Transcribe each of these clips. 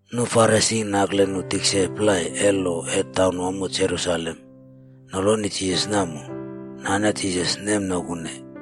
Nu Farisi nakle nu tikse plai e lo e taunwamo Jerusalem noloni Jisas namo, nane Jisas nemnokune.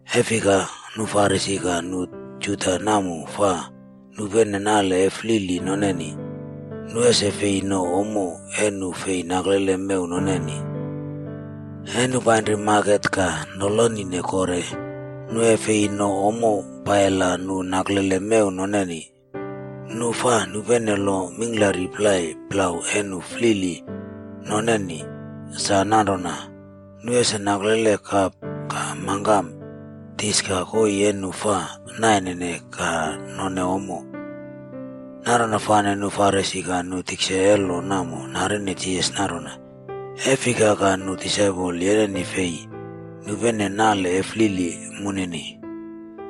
E fika, nu Farisi ka nu Juda namo fa nupene nale e flili noneni, nu ese fi no ommo e nu fi naklele mew noneni. E nu painri maket ka noloni kore, nu e fi no ommo paila nu naklele mew noneni. Nu fa nupene lo mingklari plai plau e nu flili noneni, sa nanrona, nu ese naklele kap ka mangkam, dis ka koii e nu fa naine ka none ommo. Nanrona fane nu Farisi ka nu tikse e lo namo narine Jisas nanrona, “E fika ka nu disaipol yeneni fi nupene nale e flili moneni?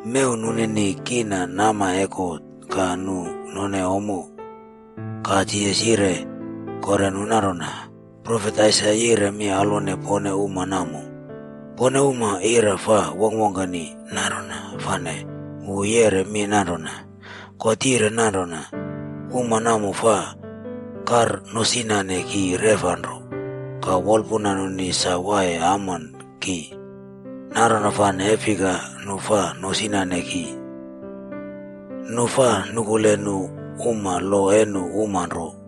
Mew nunini kiina nama e God ka nu nonene ommo.” Ka Jisas yire kore nu nanrona, “Profet Aisaia yire mi alwone pone uma namo. Pone uma ira fa wongkwongkeni, nanrona fane wu yeꞌre mi nanrona, ‘God yire nanrona, “Uma namo fa karnosinane ki reꞌfa nro, ka wolpuna nunini sa waiye amon ki. Nanrona fane e fika nu fa nosinane ki? Nu fa nukule nu uma lo e nu uma nro.”’”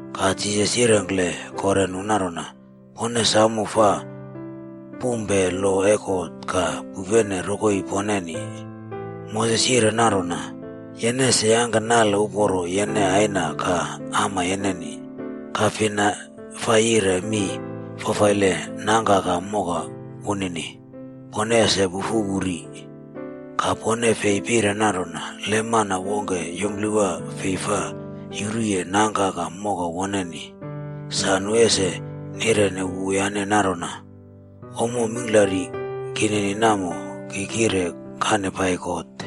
Ka Jisas yirengkle kore nu nanrona, “Pone samo fa pumpe lo e God ka pupene rokoi poneni. Moses yire nanrona, ‘Yene ese yangke nale uporo yene aina ka ama yeneni.’ Ka ‘fina fa yire mi fafaile nangka ka moka wunini, pone ese pufu wu ri.’ Ka, pone fa pire nanrona, ‘Le mana wongke yumplewa fi fa yuruye nangka ka moka woneni, sa wu ese yireni wuyane nanrona, “Ommo mingklari kinini namo, ki kire kane pai God.a” ’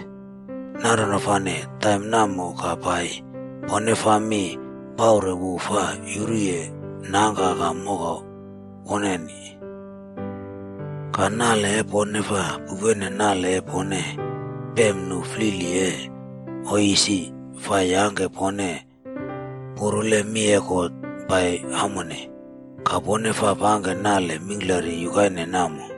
Nanrona fane taim namo ka pai, pone fa mi paure wu fa yuru nangka ka moka woneni. Ka nale e pone fa pupene nale e pone pem nu flili e oiy isi, fa yangke pone purule mi e God pai amone. Ka pone fa pangke nale mingklari yukaine namo.”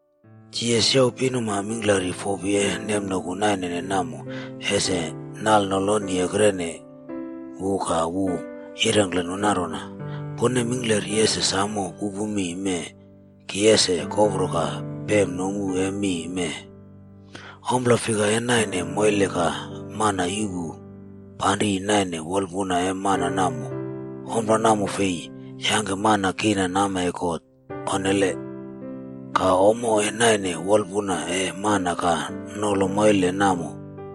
Jisas youw pinuma mingklari fopi e nemnoku nainene namo ese nalnoloni ekrene wu ka wu yirengkle nu nanrona, “Pone mingklari ese samo pupu mi mee ki ese kopro ka pem nomu e mi mee. Ompla fika e naine moile ka mana yuꞌpu panri naine wolpuna e mana namo, ompla namo fi yangke mana kiina nama e God, onnele. Ka, ommo e naine wolpuna e mana ka nolo moile namo,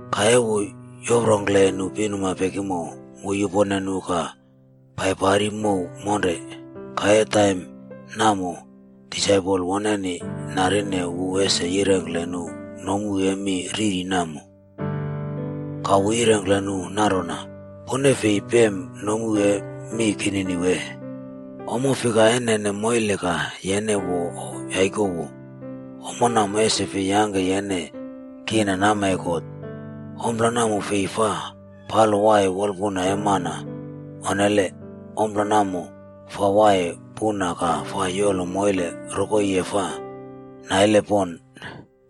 Ka e wu yoprongkle nu pinuma pekimo, wu yupone nu ka paipari mow monre. Ka e taim namo, disaipol woneni narine wu ese yirengkle nu nomu e mi riri namo. Ka wu yirengkle nu nanrona, “Pone fi pem nomu e mi kinini wee? Ommo fika e nene moile ka yene wo o yaikowo, ommo namo ese fi yangke yene kiina nama e God. Ompla namo fi fa palo waiye wolpuna e mana, onnele. Ompla namo fa waiye puna ka fa yolo moile rokoi e fa naile pon.”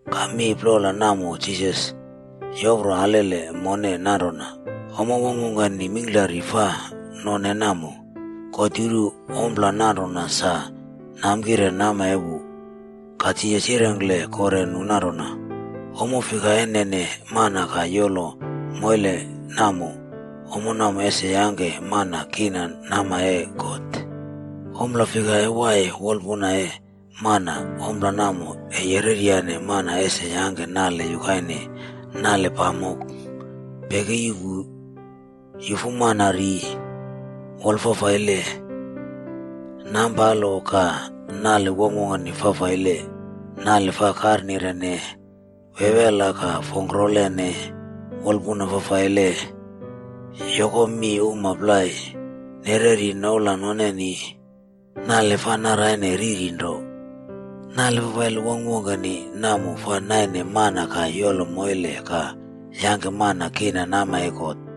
Ka mi plola namo Jisas yopro alele mone nanrona ommo wongkwongkeni mingklari fa none namo, God yuru ompla nanrona sa namkire nama e wu. Ka Jisas yirengkle kore nu nanrona, “Ommo fika e nene mana ka yolo moile namo, ommo namo ese yangke mana kiina nama e God. Ommo fika e waiye wolpuna e mana ommo namo e yereryane mana ese yangke nale yukaine, nale pamok, peki yuꞌpu, yufu mana ri, wola fafaile, nampalo ka, nale wongkwongkeni fafaile, nale fa karnire, wewela ka fongkrolene, wolpuna fafaile, yoko mi uma plai, nereri noula noneni, nale fa naraine riri nro. Nale fafaile wongkwongkeni namo fa naine mana ka yolo moile ka yangke mana kiina nama e God.”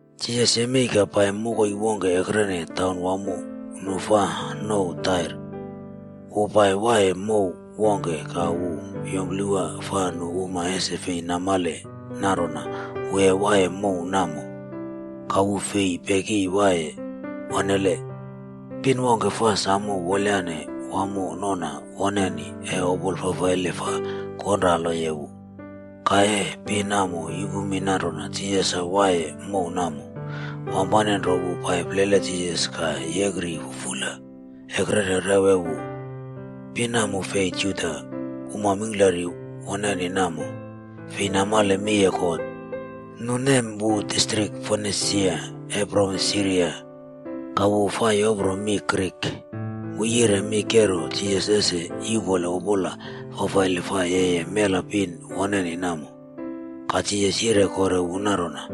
Jisas yemei ka pai mokoi wongke ekrene taunwamo nu nouw Tair. Wu pai waiye mow wongke, ka wu yumplewa fa nu uma ese fi namale nanrona wu e waiye mow namo. Ka wu fi peki waiye, onnele. Pin wongke fa samo wolyane wamo nona wonenei e opola fafaile fa konraloye wu. Ka e pin namo yupu mi nanrona Jisas sa waiye mow namo, wampane nro wu pai plele Jisas ka yekri fufula ekrene rew e wu. Pin namo fi Juda. Uma mingklari woneni namo, fi namale mi e God. Nu nem wu distrik Fonisia e provins Siria. Ka wu fa yopro mi “Grik.” Wu yire mi kero Jisas ese yuꞌpole opola fafaile fa yeye mela pin woneni namo. Ka Jisas yire kore wu nanrona,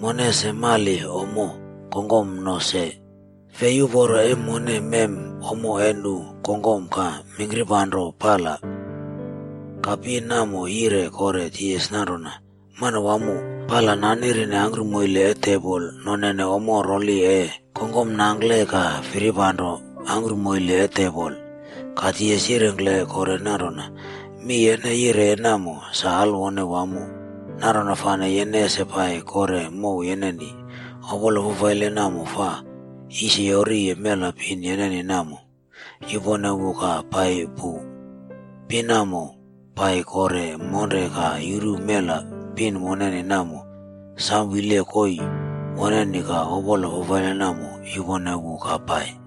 “Mone ese mali ommo kongkom no se. Fi uporo e mone mem ommo e nu kongkom ka mingkirpanro pala.d” Ka pin namo yire kore Jisas nanrona, “Manawamo, pala nanerine angkrumoile e tebol nonene ommo rola e kongkom nangkle ka firipanro angkrumoile e tebol.” Ka Jisas yire wu kore nanrona, “Mi yene yireye namo, sa alwone wamo. Nanrona fane yene ese pai kore mow yeneni. Opola fafaile namo fa yisiyori mela pin yeneni namo, yupone wu ka pai pu.” Pin namo, pai kore monre ka yuru mela pin woneni namo, samo wile koii woneni ka opola fafaile namo yupone wu ka pai.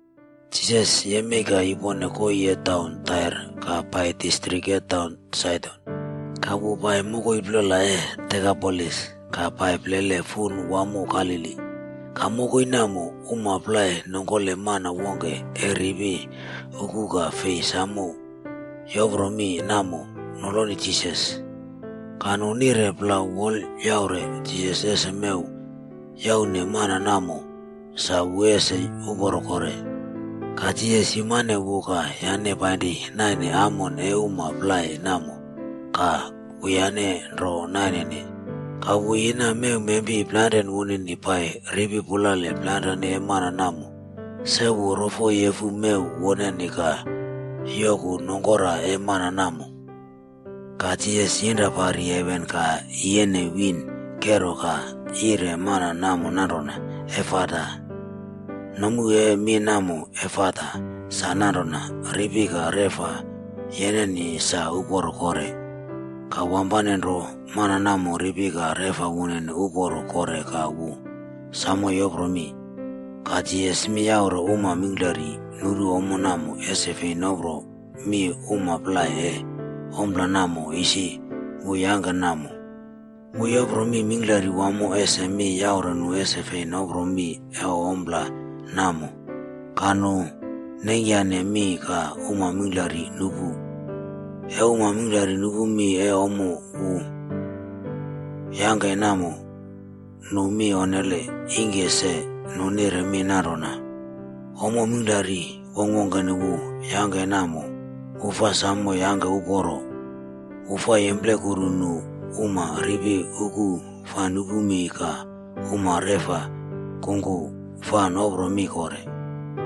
Jisas yemei ka yupone koii e taun Tair, ka pai distrik e taun Saidon. Ka wu pai mokoi plola e Dekapolis, ka pai plele fun wamo Galili. Ka mokoi namo, uma plai nongkole mana wongke e ripi uku ka fi samo yopro mi namo noloni Jisas. Ka nu nire plau wolyaure Jisas ese mew yaune mana namo sa wu ese uporo kore. Ka Jisas yumane wu ka yane painri naine amon e uma plai namo, ka wuyane nro nainene. Ka wu yina mewmempi plainre wunini pai ripi pulale plainren e mana namo. Se wu rofoyefu mew woneni ka yoku nongkora e mana namo. Ka Jisas yinra pari heven ka yiyene wiin kero ka yire mana namo nanrona, “Efata.” Nomu e mi namo “Efata” sa nanrona, “Ripi ka reꞌfa yeneni sa uporo kore.” Ka wampane nro, mana namo ripi ka reꞌfa wunini uporo kore ka wu samo yopro mi. Ka Jisas mi yaure uma mingklari nuru ommo namo ese fi nopro mi uma plai e ompla namo isi wu yangke namo. Wu yopro mi mingklari wamo ese mi yaure nu ese fi nopro mi e ompla namo. Ka nu neingkyane mi ka uma mingklari nupu. E uma mingklari nupu mi e ompla wu yangke namo, nu mi onnele. Ingke se, nu nire mi nanrona, “Ommo mingklari wongkwongkeni wu yangke namo, wu fa samo yangke uporo. Wu fa yemplekuru nu uma ripi uku fa nupu mi ka uma reꞌfa kungku fa nopro mi kore.”